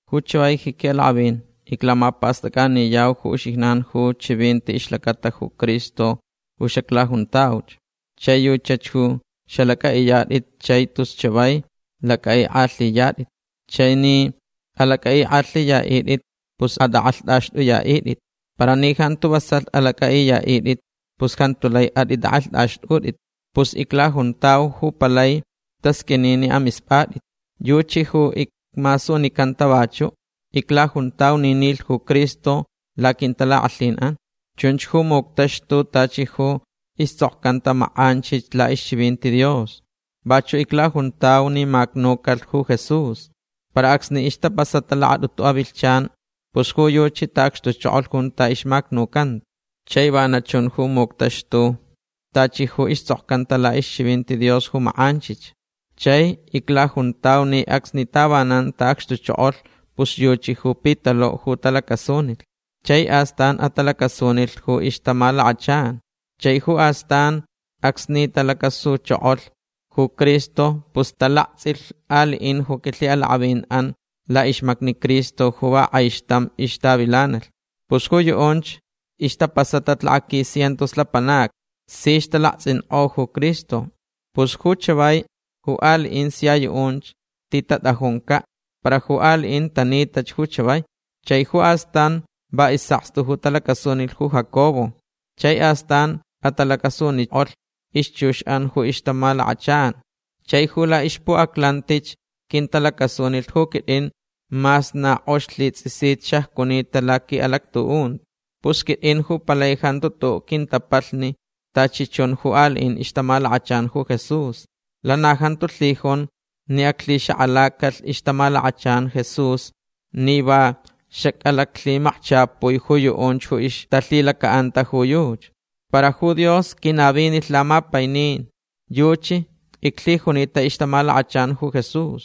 Ju chavai ji quiʼalakʼavin iclamapastʼacʼaniyau ju uxijnan ju chivinti ixlacata ju Cristo ju xaclajuntauch. Chai yuchach ju xalacʼaʼiyatʼit chai tus chavai lacʼaʼikʼalhiyatʼit. Chai ni alacʼaʼikʼalhiyaʼitʼit pus atʼakʼalhtʼaxtʼuyaʼitʼit. Para ni jantu vasalh alacʼaʼiyaʼitʼit pus jantu lai atʼitʼakʼalhtʼaxtʼutʼit. Pus iclajuntau ju palai tasqʼuini ni amispʼatʼit. Yuchi ju icmasunicanta vachuʼ. Iclajuntau ni nilh ju Cristo laquintalakʼalhinʼan. Chunch ju muctaxtulh tachi ju istsʼokcanta makʼanchich laʼixchivinti Dios. Vachuʼ iclajuntauch ni macnucalh ju Jesús. Para acsni ixtapasata lakatʼutu avilhchan pus ju yuchi taʼacxtuchokolh junta ixmacnucanta. Chai vana chunch ju muctaxtulh tachi ju istsʼokcanta laʼixchivinti Dios ju makʼanchich. Chai iclajuntau ni acsni tavanan taʼacxtuchokolh pus yuchi ju Pitaluʼ ju talacasunilh. Chai astan atalacasunilh ju ixtamalakachan. Chai ju astanch acsni talacasuchokolh ju Cristo pus talaktsʼilh aliʼin ju quilhiʼalakʼavinʼan laʼixmacni Cristo ju va kʼaixtamch ixtavilanalh. Pus ju yuʼunch ixtapasatach lakaquis cientos lapanacni. Sich talaktsʼinkʼo ju Cristo. Pus ju chavai ju aliʼin sia yuʼunch titatʼajuncaʼ. Para ju aliʼinch tanitach ju chavai. Chai ju astan va isʼakstu ju talacasunilh ju Jacobo. Chai astan atalacasunikʼolhch ixchuxʼan ju ixtamalakachan. Chai ju laʼixpuʼaclantich quintalacasunilh ju quitʼin mas na kʼox lhitsʼisit xacjunita laquiʼalactuʼunti. Pus quitʼin ju palai jantu tuʼuʼ quintapalhni tachi chun ju aliʼin ixtamalakachan ju Jesús. Lana jantu lhijun ni aclhixakʼalacalh ixtamalakachan Jesús ni va xacʼalaclhimakchapui ju yuʼunch ju ixtalhilacaʼanta ju yuchi. Para ju Dios quinavinilh lamapainin. Yuchi iclhijunita ixtamalakachan ju Jesús.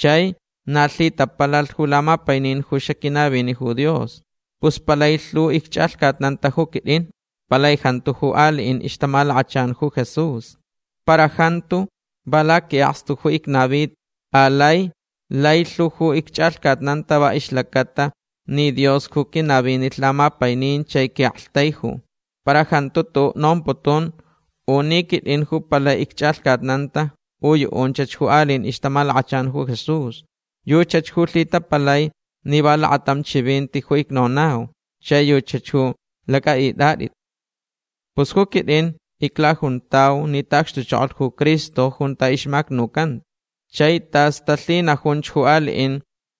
Chai na lhitapalalh ju lamapainin ju xaquinavini ju Dios. Pus palai lhu icchʼalhcatnanta ju quitʼin. Palai jantu ju aliʼin ixtamalakachan ju Jesús. Para jantu va laquiʼakstu ju icnavita. Alai lai lhu ju icchʼalhcatnan va ixlacata ni Dios ju quinavinilh lamapainin chai quiʼaktaiju. Para jantu tuʼuʼ nomputun u ni quitʼin ju palai icchʼalhcatnanta u yuʼunchach ju aliʼin ixtamalakachan ju Jesús. Yuchach ju lhitapalai ni va lakatam chivinti ju icnonau chai yuchach ju lacʼaʼitʼatʼit. Pus ju quitʼin iclajuntau ni taʼacxtuchokolh ju Cristo junta ixmacnucanta. Chai tas talhinajunch ju aliʼin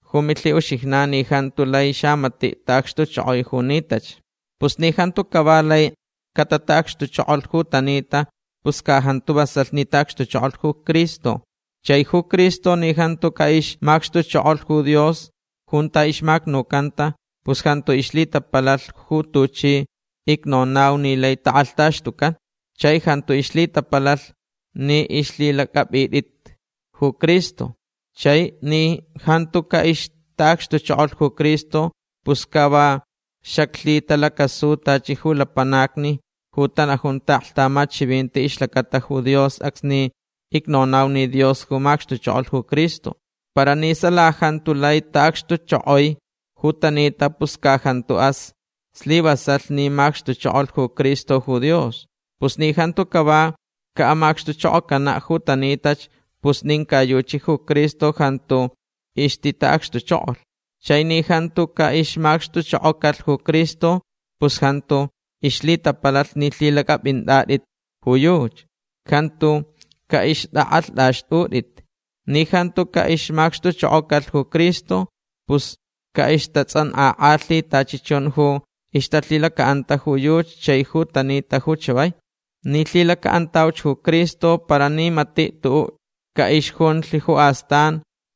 ju milhiʼuxijnan ni jantu lai xamatiʼ taʼacxtuchokoi ju nitach. Pus ni jantu cava lai catataʼacxtuchokolh ju tanita pus ca jantu vasalh ni taʼacxtuchokolh ju Cristo. Chai ju Cristo ni jantu caʼixmacxtuchokolh ju Dios junta ixmacnucanta pus jantu ixlhitapalalh ju tuchi icnonau ni lai takʼalhtaxtucan. Chai jantu ixlhitapalalh ni ixlhilacʼapʼintʼit ju Cristo. Chai ni jantu caʼixtaʼacxtuchokolh ju Cristo pus ca va xaclhitalacasuch tachi ju lapanacni ju tanajun taʼaklhtamat chivinti ixlacata ju Dios acsni icnonau ni Dios ju macxtuchokolh ju Cristo. Para ni sala jantu lai taʼacxtuchokoi ju tanita pus ca jantaʼas slivasalh ni macxtuchokolh ju Cristo ju Dios. Pus ni jantu cava caʼamacxtuchokocanaʼ ju tanitach pus nin ca yuchi ju Cristo jantu ixtitaʼacxtuchokolh. Chai ni jantu caʼixmacxtuchokocalh ju Cristo pus jantu ixlhitapalalh ni lhilacʼapʼintʼatʼit ju yuchi. Jantu caʼixtʼakʼalhtʼaxtʼutʼit. Ni jantu caʼixmacxtuchokocalh ju Cristo pus caʼixtatsʼankʼakʼalhi tachi chun ju ixtalhilacaʼanta ju yuchi chai ju tanita ju chavai. Ni lhilacaʼantauch ju Cristo para ni matiʼ tuʼuʼ caʼixjunlh ju astan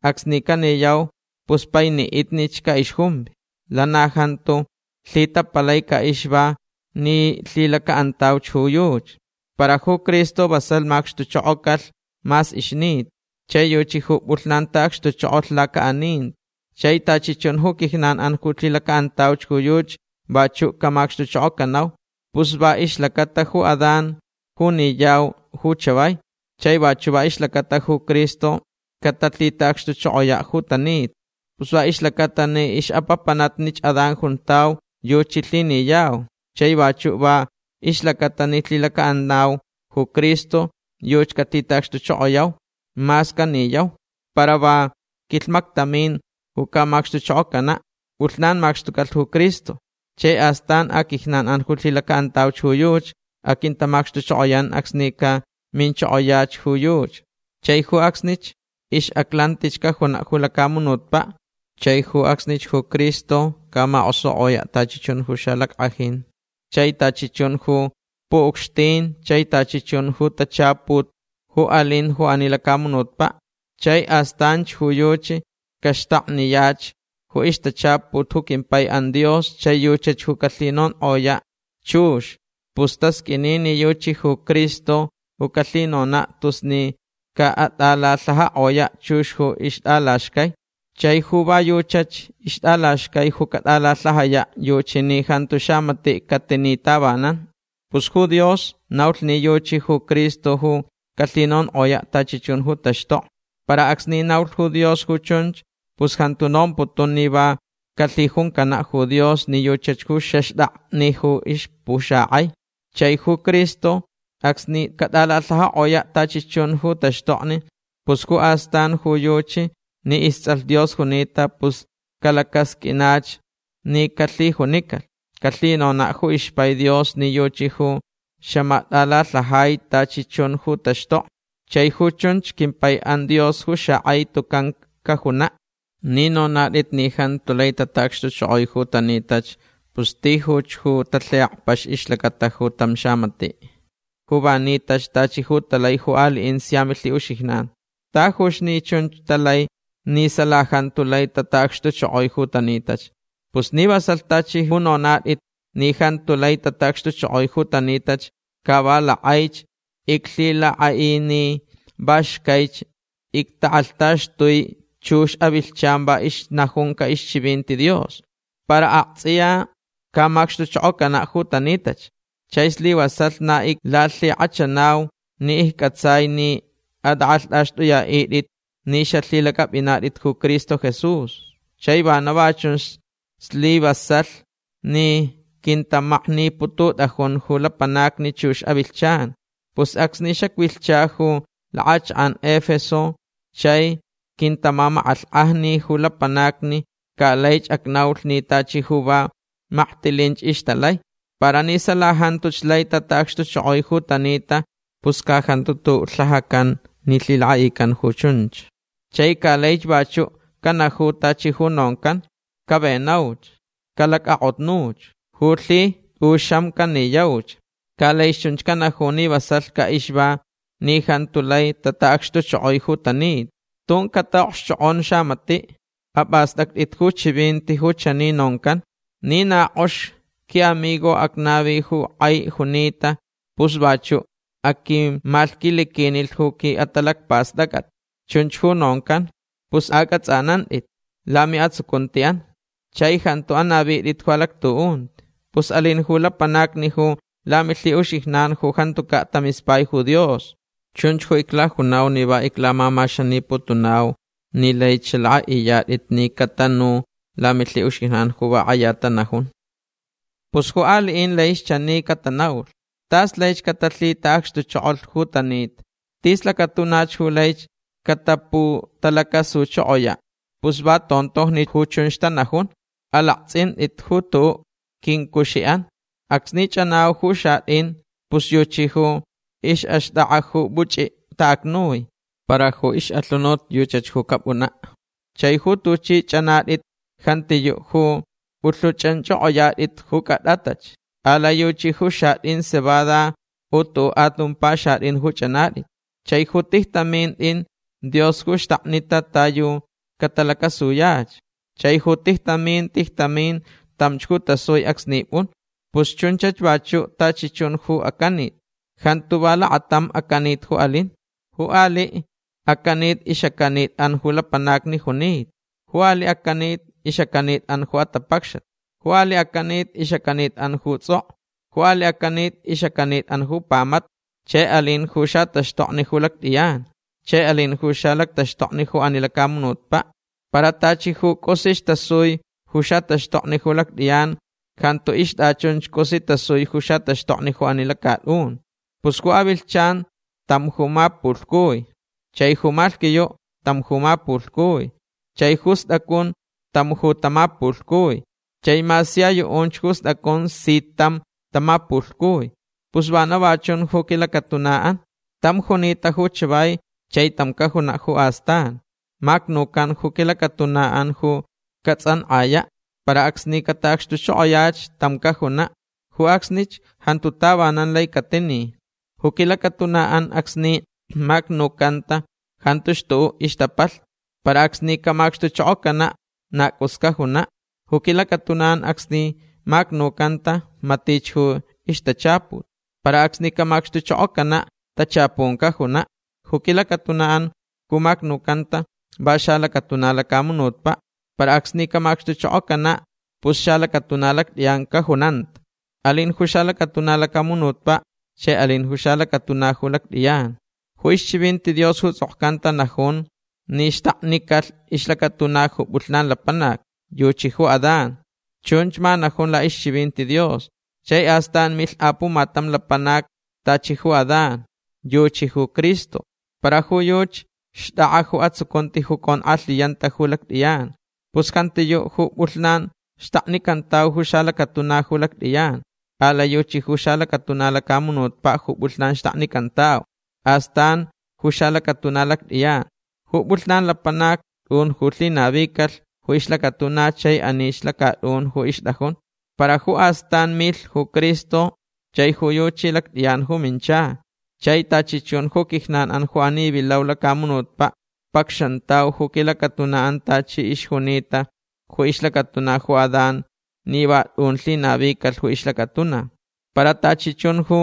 acsni caniyau pus painiʼitnich caʼixjumvi. Lana jantu lhitapalai caʼixva ni lhilacaʼantauch ju yuchi. Para ju Cristo vasalh macxtuchokocalh mas ixnita. Chai yuchi ju pʼulhnan taʼacxtuchokolh lacaʼaninti. Chai tachi chun ju quijnanʼan ju lhilacaʼantauch ju yuchi vachuʼ camacxtuchokocanau. Pus va ixlacata ju Adán ju niyau ju chavai. Chai vachuʼ va ixlacata ju Cristo catalhitaʼacxtuchokoyaʼ ju tanita. Pus va ixlacaʼatalh ni ixʼapapanatnich Adán juntau yuchi lhiniyau. Chai vachuʼ va ixlacaʼatalh ni lhilacaʼanau ju Cristo yuchi calhitaʼacxtuchokoyauch mas caniyauch. Para va quilhmactamin ju camacxtuchokocanaʼ. Pʼulhnan macxtucalh ju Cristo. Chai astan aquijnanʼan ju lhilacaʼantauch ju yuchi aquintamacxtuchokoyan acsni caminchokoyach ju yuchi. Chai ju acsnich ixʼaclantich cajunaʼ ju lacamunutpaʼ. Chai ju acsnich ju Cristo camakʼosukʼoyaʼ tachi chun ju xalackʼajin chai tachi chun ju puʼucxtin chai tachi chun ju tachaput ju alinch ju ani lacamunutpaʼ. Chai astanch ju yuchi caxtakniyach ju ixtachaput ju quimpaiʼan Dios chai yuchach ju calhinonkʼoyach chux. Pus tasqʼuini ni yuchi ju Cristo ju calhinonaʼ tus ni caʼatʼalalhajakʼoyaʼ chux ju ixtʼalaxcai. Chai ju va yuchach ixtʼalaxcai ju catʼalalhajayaʼ yuchi ni jantu xamatiʼ catini tavanan. Pus ju Dios naulh ni yuchi ju Cristo ju calhinonkʼoyaʼ tachi chun ju taxtokni. Para acsni naulh ju Dios ju chunch pus jantu nomputun ni va calhijuncanaʼ ju Dios ni yuchach ju xaxtakni ju ixpuxakʼai. Chai ju Cristo acsni catʼalalhajakʼoyaʼ tachi chun ju taxtokni pus ju astan ju yuchi ni istsʼalh Dios junita pus calacasqʼuinach ni calhijunicalh. Calhinonaʼ ju ixpai Dios ni yuchi ju xamatʼalalhajai tachi chun ju taxtokni. Chai ju chunch quimpaiʼan Dios ju xakʼai tucan cajunaʼ. Ni nonatʼit ni jantu lai tataʼacxtuchokoi ju tanitach pus tijuch ju talhiʼakpax ixlacata ju tam xamatiʼ ju va nitach tachi ju talai ju aliʼin sia milhiʼuxijnan. Tajuch ni chunch talai ni sala jantu lai tataʼacxtuchokoi ju tanitach. Pus ni vasalh tachi ju nonatʼit ni jantu lai tataʼacxtuchokoi ju tanitach ca va lakʼaich iclhilakʼaʼi ni va xcaich ictakʼalhtaxtui chux avilhchan va ixnajunca ixchivinti Dios. Para aktsʼiya camacxtuchokocanaʼ ju tanitach. Chai slivasalh na iclalhikʼachanau ni iccʼatsai ni atʼakʼalhtʼaxtʼuyaʼitʼit ni xalhilacʼapʼinatʼit ju Cristo Jesús. Chai vana va chun islivasalh ni quintamaknipututʼajun ju lapanacni chux avilhchan. Pus acsni xacvilhcha ju lakʼachakʼan Efeso chai quintamamakʼalhkʼajni ju lapanacni ca laich acnaulh ni tachi ju va maktilinch ixtalai. Para ni sala jantuch lai tataʼacxtuchokoi ju tanita pus ca jantu tuʼuʼ lhajacan ni lhilakʼaʼican ju chunch. Chai ca laich vachuʼ canaju tachi ju noncan: “Cavenauch. Calacʼakʼotnuch. Ju lhi tʼuxam caniyauch”. Ca laich chunch canaju ni vasalh caʼixva ni jantu lai tataʼacxtuchokoi ju tanita. Tun cataʼokxchokʼon xamatiʼ. Apʼastʼactʼit ju chivinti ju chani noncan: “Ni na kʼox quiʼamigo acnavi ju kʼai junita pus vachuʼ aquimalhquiliquinilh ju quiʼatalacpastʼacʼat”. Chunch ju noncan. Pus acʼatsʼanantʼit lamiʼatsucuntiʼan. Chai jantu anavitʼit ju alactuʼunti. Pus alin ju lapanacni ju lamilhiʼuxijnan ju jantucaʼ tamispai ju Dios. Chunch ju iclajunau ni va iclamamaxaniputunau ni laich xalakʼaʼiyatʼit ni catanu lamilhiʼuxijnan ju va kʼaya tanajun. Pus ju aliʼin laich chani catanaulh: “Tas laich catalhitaʼacxtuchokolh ju tanita. Tis lacatunach ju laich cataputalacasuchokoyaʼ”. Pus va tontojni ju chunch tanajun. Alaktsʼintʼitch ju tuʼuʼ quincuxiʼan. Acsni chʼanau ju xatʼin pus yuchi ju ixʼaxtʼakʼa ju puchʼitaʼacnui. Para ju ixʼalhunut yuchach ju capʼunaʼ. Chai ju tuchi chʼanatʼit jantiyuʼ ju pʼulhuchʼanchʼokʼoyatʼit ju cʼatʼatʼach. Alai yuchi ju xatʼin cebada u tuʼuʼ atumpa xatʼin ju chʼanatʼit. Chai ju tijtamin tʼin Dios ju xtaknita ta yu catalacasuyach. Chai ju tijtamin tijtamin tamch ju tasui acsni pʼun. Pus chunchach vachuʼ tachi chun ju acanit. Jantu va lakatam acanit ju alin. Ju aliʼ acanit ixʼacanitʼan ju lapanacni junita. Ju aliʼ acanit ixʼacanitʼan ju atapacxat. Ju aliʼ acanit ixʼacanitʼan ju tsʼokʼo. Ju aliʼ acanit ixʼacanitʼan ju pamata. Chai alin ju xataxtokni ju lactʼiyan. Chai alin ju xalactaxtokni ju ani lacamunutpaʼ. Para tachi ju cʼusich tasui ju xataxtokni ju lactʼiyan jantu ixtʼachun cʼusi tasui ju xataxtokni ju ani lacatʼun. Pus ju avilhchan tam ju mapulhcui. Chai ju malhquiyuʼ tam ju mapulhcui. Chai ju stʼacun tam ju tamapulhcui. Chai mas sia yuʼunch ju stʼacun si tam tamapulhcui. Pus vana va chun ju quilacatunaʼan. Tam junita ju chavai chai tam cajunaʼ ju astan. Macnucan ju quilacatunaʼan ju catsʼankʼayaʼ. Para acsni cataʼacxtuchokoyach tam cajunaʼ. Ju acsnich jantu tavanan lai catini. Ju quilacatunaʼan acsni macnucanta jantuch tuʼuʼ ixtapalhni. Para acsni camacxtuchokocanaʼ na cʼus cajunaʼ. Ju quilacatunaʼan acsni macnucanta matich ju ixtachaput. Para acsni camacxtuchokocanaʼ tachapun cajunaʼ. Ju quilacatunaʼan ju macnucanta va xalacatuna lacamunutpaʼ. Para acsni camacxtuchokocanach pus xalacatuna lactʼiyan cajunanta. Alin ju xalacatuna lacamunutpaʼ. Chai alin ju xalacatuna ju lactʼiyan. Ju ixchivinti Dios ju tsʼokcanta najun ni xtaknicalh ixlacatuna ju pʼulhnan lapanac. Yuchi ju Adán. Chunch ma najun laʼixchivinti Dios. Chai astan milh apumatam lapanac tachi ju Adán. Yuchi ju Cristo. Para ju yuchi xtʼakʼa ju atsucunti ju conkʼalhiyanta ju lactʼiyan. Pus jantiyuʼ ju pʼulhnan xtaknicantau ju xalacatuna ju lactʼiyan. Alai yuchi ju xalacatuna lacamunutpaʼ ju pʼulhnan xtaknicantau. Astan ju xalacatuna lactʼiyan. Ju pʼulhnan lapanac tʼun ju lhinavicalh ju ixlacatuna chai anich lacatʼun ju ixtʼajun. Para ju astan milh ju Cristo. Chai ju yuchi lactʼiyan ju mincha. Chai tachi chun ju quijnanʼan ju ani vilau lacamunutpaʼ pacxantau ju quilacatunaʼan tachi ixjunita ju ixlacatuna ju Adán ni va tʼun lhinavicalh ju ixlacatuna. Para tachi chun ju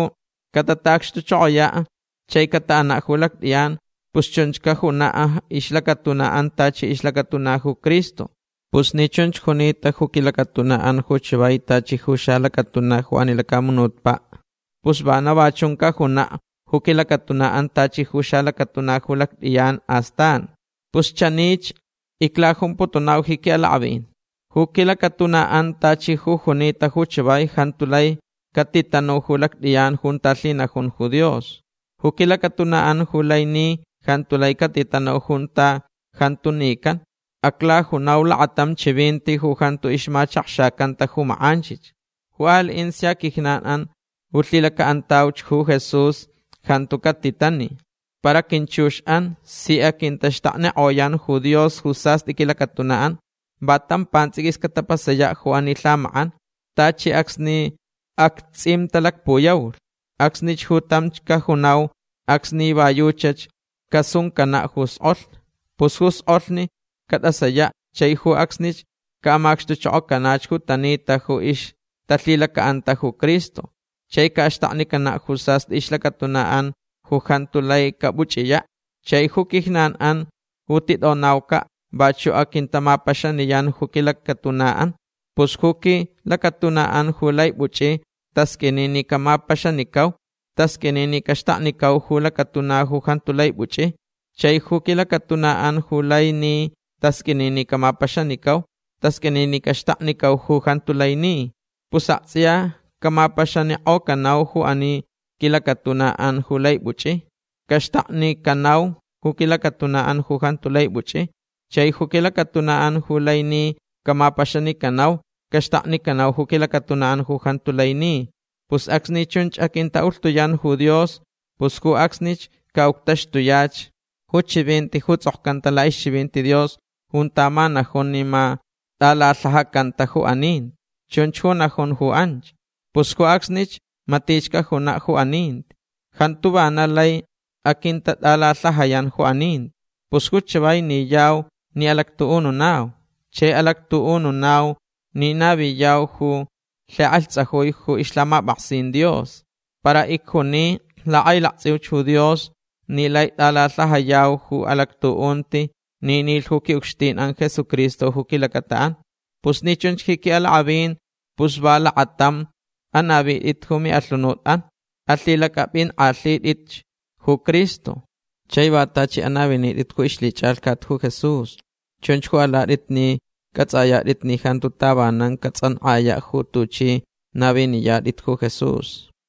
catataʼacxtuchokoyaʼ chai cataʼanaʼ ju lactʼiyan pus chunch cajunaʼ ixlacatunaʼan tachi ixlacatuna ju Cristo. Pus ni chunch junita ju quilacatunaʼan ju chavai tachi ju xalacatuna ju ani lacamunutpaʼ pus vana va chun cajunaʼ ju quilacatunaʼan tachi ju xalacatuna ju lactʼiyan astan. Pus chanich iclajumputunau ji quiʼalakʼavin. Ju quilacatunaʼan tachi ju junita ju chavai jantu lai catitanu ju lactʼiyan junta lhinajun ju Dios. Ju quilacatunaʼan ju lai ni jantu lai catitanu junta jantu nican. Aclajunau lakatam chivinti ju jantu ixmachakxacanta ju makʼanchich. Ju aliʼin sia quijnanʼan ju lhilacaʼantauch ju Jesús jantu catitani. Para quinchuxʼan si aquintaxtaknikʼoyan ju Dios ju sastʼi quilacatunaʼan. Va tam pantsʼiquis catapasayaʼ ju ani lhamakʼan. Tachi acsni actsʼimtalacpuyaulh. Acsnich ju tamch cajunau acsni va yuchach casuncanaʼ ju skʼolh. Pus ju skʼolh catʼasayaʼ chai ju acsnich caʼamacxtukʼocanach ju tanita ju ixtalhilacaʼanta ju Cristo. Chai caʼaxtaknicanaʼ ju sastʼi ixlacatunaʼan ju jantu lai capuchʼiyaʼ. Chai ju quijnanʼan ju titʼonaucaʼ vachuʼ aquintamapaxaniyan ju quilacatunaʼan. Pus ju quilacatunaʼan ju lai puchʼi tasqʼuini ni camapaxanicau. Tasqʼuini ni caxtaknicau ju lacatuna ju jantu lai puchʼi. Chai ju quilacatunaʼan ju lai ni tasqʼuini ni camapaxanicau. Tasqʼuini ni caxtaknicauch ju jantu lai ni. Pus aktsʼiya camapaxanikʼocanau ju ani quilacatunaʼan ju lai puchʼi. Caxtaknicanauch ju quilacatunaʼan ju jantu lai puchʼi. Chai ju quilacatunaʼan ju lai ni camapaxanicanau. Caxtaknicanauch ju quilacatunaʼan ju jantu lai ni. Pus acsni chunch aquintaʼulhtuyan ju Dios pus ju acsnich caʼuctaxtuyach ju chivinti ju tsʼokcanta laʼixchivinti Dios junta ma najun ni ma tʼalalhajacanta ju aninti. Chunch ju najun ju anch. Pus ju acsnich matich cajunaʼ ju aninti. Jantu vana lai aquintatʼalalhajayan ju aninti. Pus ju chavai niyau ni alactuʼununau. Chai alactuʼununau ni naviyau ju lhikʼalhtsajui ju ixlhamapʼaksin Dios. Para icjuni lakʼailaktsʼiuch ju Dios ni lai tʼalalhajayau ju alactuʼunti ni nilh ju quiʼucxtinʼan Jesucristo ju quilacataʼan. Pus ni chunch ji quiʼalakʼavin pus va lakatamch anavitʼit ju miʼalhunutʼan. Alhilacʼapʼinkʼalhitʼitch ju Cristo. Chai va tachi anavinitʼit ju ixlhichʼalhcat ju Jesús. Chunch ju alatʼit ni cʼatsʼayatʼit ni jantu tavanan catsʼankʼayaʼ ju tuchʼi naviniyatʼit ju Jesús.